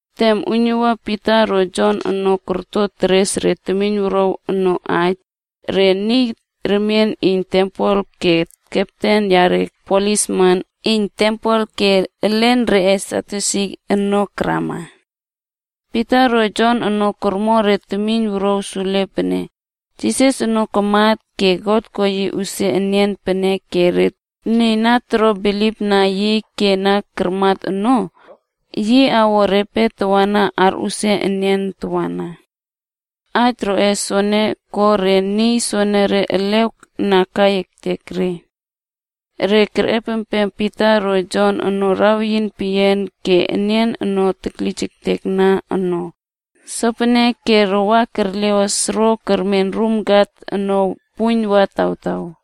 Tem uiynuwua Pita ro Jon ono korto teres re temiyn wuruaw ono aij, re niy remien iyn tempel ke kepten yare plisman iyn tempel ke elen reꞌe Sadyusi ono karama. Pita ro Jon ono kormo re temiyn wuruaw sule pene, Jisas ono kamat ke God ko yi usia enian peneke re niy na toro bilipna yi ke na karmat ono, yi awo repe tawana arꞌusia enian tawana. Aij roꞌe soene ko re niy soenere elew na kai ektek re. Re kerꞌepem Pita ro Jon ono raweyin peyian ke nian ono teklijektekna ono, sopeneke re wa kerleꞌos ro kermen rum kat ono puiyn wa tawtaw.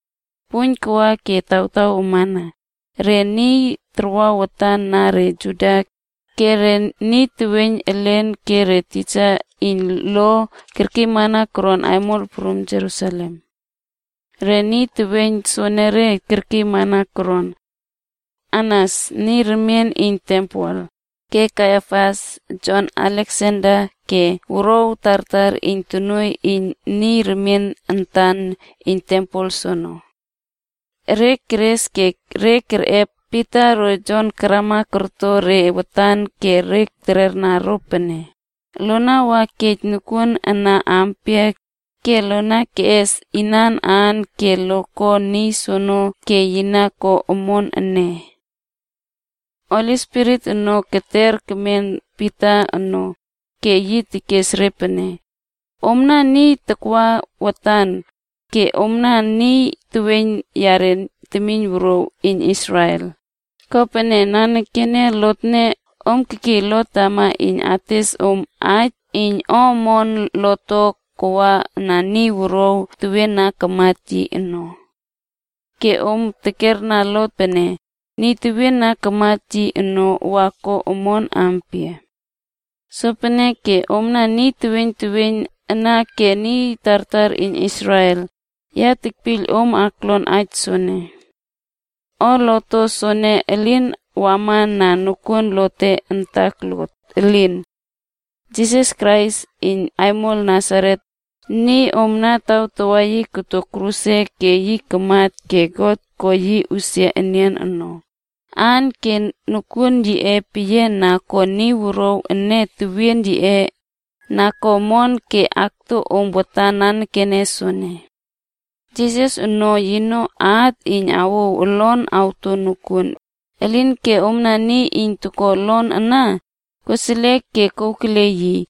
Puiyn kawa ke tawtaw wama, re niy tarwa watan na re Juda, ke re niy teweiyn elen ke re tisa iyn lo kerkiymana koron aimol prum Jerusalem. Re niy teweiyn soenere kerkiymana koron. Anas (niy remien antan iyn tempel), ke Kaiafas, Jon, Aleksander ke re wuruaw tartar iyn tonuoiy iyn niy remien antan iyn tempel soono. Re keres ke re kerꞌep Pita ro Jon karama korto re watan ke re terera ro pene, “Lona wa kej nokuon ana ampia ke lo keꞌes inan aan ke lo ko niy soene ke yi na ko omon ene?” Holi Spirit ono keter kemen Pita ono, ke yi tekes re pene, “Omna niy takwa watan, ke omna niy teweiyn yare temiyn wuruaw iyn Israel, kopene nanekene lotne om kekiy lot tama iyn ates om aij iyn o omon lot to kawa na niy wuruaw tewien na kamat yi ono. Ke om tekerna lot pene, niy tewien na kamat yi ono wa ko omon ampia? Sopeneke omna niy teweiyn teweiyn ana ke niy tartar iyn Israel, ya tekpiyl om lon aij soene. O lot to soene elin wama na nokuon lote antak lot, elin. Jisas Krais iyn Aimol Nasaret, niy om na tawtawa yi koto kruse ke yi kamat ke God ko yi usia enian ono, aan ke nokuon yiꞌe peyian na ko niy wuruaw ene tewien yiꞌe na ko omon ke akto om watan nanekene soene. Jisas ono, ‘yino at iyn awouw olon awto nokuon, elinke omna niy iyn toko olon ana koseliek ke kouw kele yi,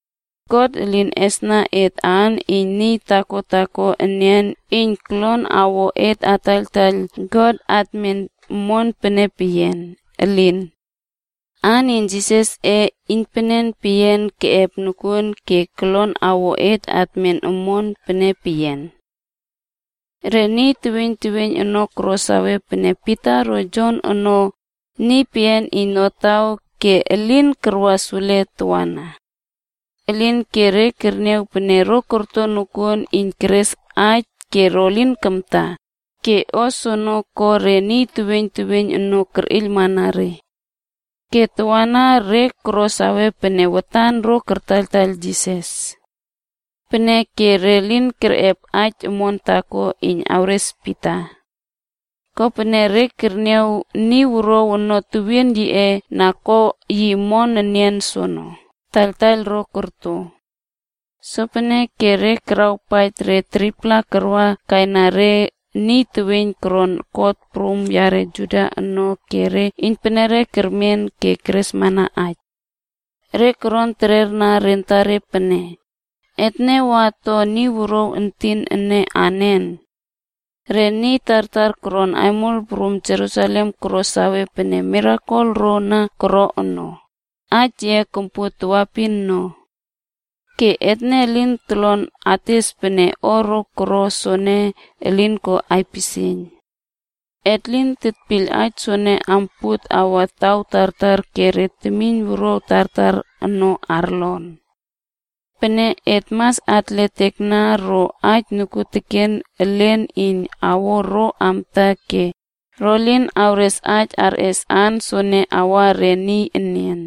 God elin esna et aan iyn niy taako taako enian iyn kolon awo et ataiyltaiyl God atmen omon pene peyian. Elin. Aan iyn Jisasꞌe iynpenen peyian keꞌep nokuon ke kolon awo et atmen omon pene peyian.” Re niy teweiyn teweiyn ono koro save pene Pita ro Jon ono niy peyian iyn notaw ke elin karwa sule tawana. Elinke re kerniaw pene ro korto nokuon iyn keres aij ke ro lin kamta, ke o soene ko re niy teweiyn teweiyn ono kerꞌeiylmana re. Ke tawana re koro sawe pene watan ro kartaiyltaiyl Jisas. Peneke re lin kerꞌep aij omon taako, iyn awres Pita. Kopene re kerniaw niy wuruaw ono tewien yiꞌe na ko yi omon enian soono, taiyltaiyl ro korto. Sopeneke re karawpaij re 3-pla karwa kaina re niy teweiyn torlon kot prum yare Juda ono ke re iynpenere kermen ke keresmana aij. Re koron terera re antare pene, “Etne wa ato niy wuruaw entin ene anen? Re niy tartar koron aimol prum Jerusalem koro sawe pene mirakel ro na koro ono, aij yiꞌe kompuot tawaepin no. Ke etne lin tolon ates pene o ro koro soene elin ko aipisieiyn. Et lin tetpiyl aij soene ampuot awa taw tartar ke re temiyn wuruaw tartar ono arlon. Peneke et mas atletekna ro aij nokuoteken elen iyn awo ro amta ke ro lin awres aij arꞌes aan soene awa re niy enian.”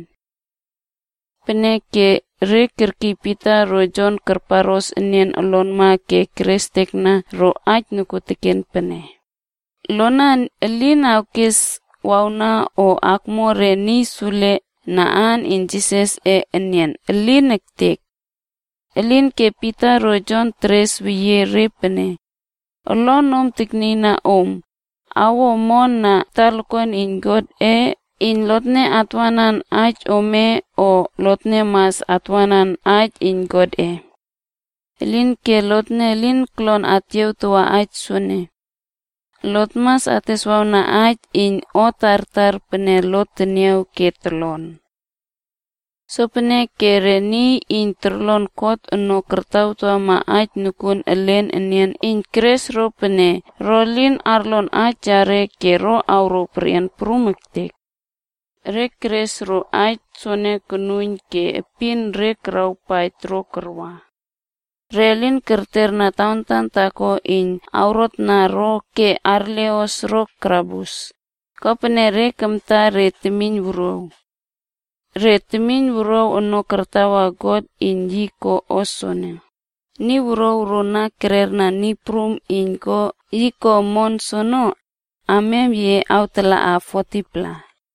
Peneke re kerkiy Pita ro Jon karparꞌos enian olonma ke re kerestekna ro aij nokuoteken pene, “Lona elin awkes wawna o akmo re niy sule na aan iyn Jisasꞌe enian. Elin ektek.” Elinke Pita ro Jon teres weyie re pene, “Olonom aknieiyna nom, awo omon na talakuan iyn Godꞌe iyn lotne atwanan aij ome o lotne mas atwanan aij iyn Godꞌe? Elinke lotne elin tolon atyiawtawa aij soene. Lot mas ateswawna aij iyn o tartar pene lot teniaw ke tolon.” Sopeneke re niy iyn torlon kot ono korꞌotawana aij nokuon elen enian iyn keres ro pene ro lin arlon aij reꞌe ke ro awrouw perꞌian prum ektek. Re keres ro aij soono konuiyn ke epin re karawpaij ro karwa. Re lin kerterna tawantan taako iyn awrotna ro ke arleꞌos ro karabus, kopene re kamta re temiyn wuruaw. Re temiyn wuruaw ono tartawa God iyn yi ko o soono, Niy wuruaw ro na kererna Niy Prum iyn ko yi ko omon soono, amiam yiꞌe awtalaꞌa 40-pla.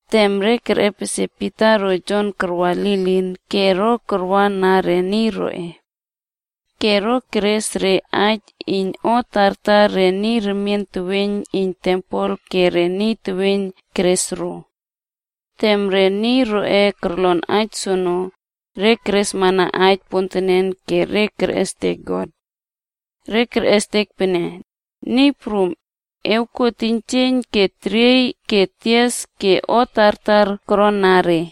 Tem re kerꞌepesie Pita ro Jon karwa lilin ke ro karwa na re niy roꞌe. Ke ro keres re aij iyn o tartar re niy remien teweiyn iyn tempel ke re niy teweiyn keres ro. Tem re niy roꞌe korlon aij soono, re keresmana aij pontenen ke re kerꞌestek God. Re kerꞌestek pene, “Niy Prum, e kuo teiynjieiyn ke teriey ke tias ke o tartar korona re.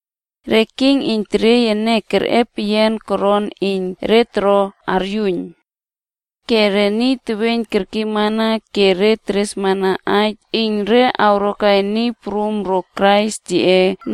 Re king iyn teriey ene kerꞌe peyian koron iyn re toro aryuiyn. Ke niy teweiyn kerkiymana ke re keresmana aij iyn re awrokai Niy Prum ro Krais yiꞌe,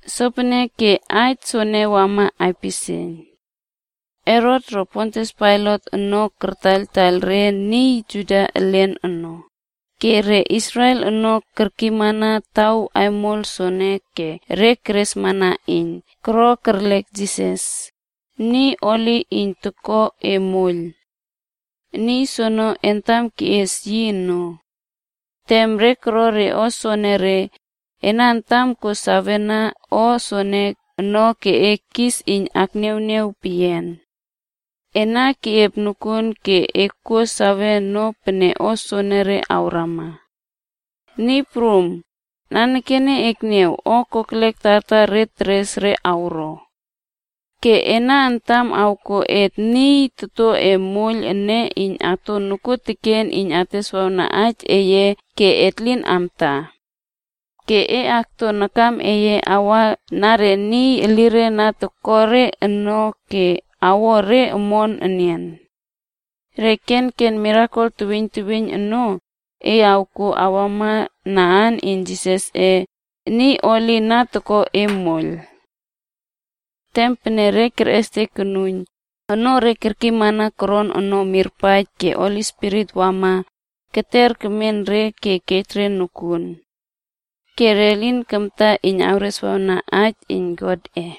Sopeneke aij soene wama aipisieiyn. Herot ro Pontius Pailat ono kartaiyl re niy Juda elin ono, ke re Israel ono kerkiymana taw aimol soene ke re keresmana iyn koro kerlek Jisas, niy holi iyn toko e moiyl. Niy soono entam keꞌies yi ono. Tem re koro re o soenere, ena antam kuo save na o soene ono ke e kis iyn akniawniaw peyian. Ena keꞌiep nokuon ke e kuo save ono pene o soenere awrama. Niy Prum, nanekene ekniaw o kokelek tartar re keres re awro. Ke ena antam awkuo et niy toto e moiyl ene iyn ato nokuoteken iyn ateswawna aij eye ke et lin amta. Ke e aktua nakam eye awa na re niy elire na toko re ono ke elire awo re omon enian. Re kenken mirakel teweiyn teweiyn ono, e awkuo awama na aan iyn Jisasꞌe, niy holi na toko e moiyl.” Tem pene re kerꞌestek konuiyn, onoo re na kerkiymana koron ono mirpaij ke Holi Spirit wama keter kemen re ke kej re nokuon. Ke re lin kamta iyn kereswawna aij iyn Godꞌe.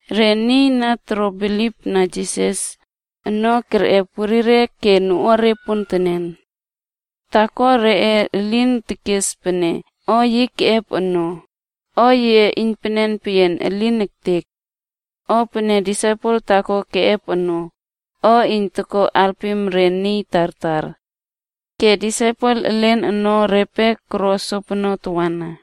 Re niy na toro bilipna Jisas, ono kerꞌep werire ke noꞌuare pontenen. Taako reꞌe elin tekes pene o yi keꞌep ono, o yiꞌe iynpenen peyian, elin ektek! O pene disaipel taako keꞌep ono, o iyn toko alpim re niy tartar. Ke disaipel elen ono repe koro sopono tawana.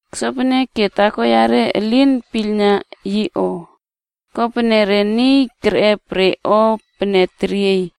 Sopeneke taako yare elin piylna yi o. Kopene re niy kerꞌep re o pene teriey,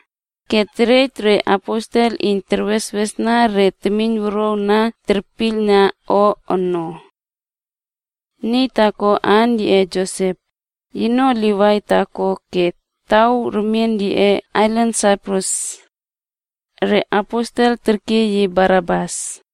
ke terej re aposel iyn terweswesna re temiyn wuruaw na terpiylna o ono. Niy taako aan yiꞌe Josep, yino Livai taako ke taw remien yiꞌe ailan Saiprus. Re aposel terkiy yi Barnabas.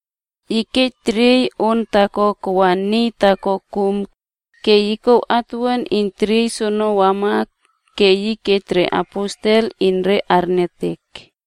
Yi kej teriey on taako kawa niy taako kum, ke yi kouw atuwuan iyn teriey soono wama ke yi kej re aposel iyn re arniawtek.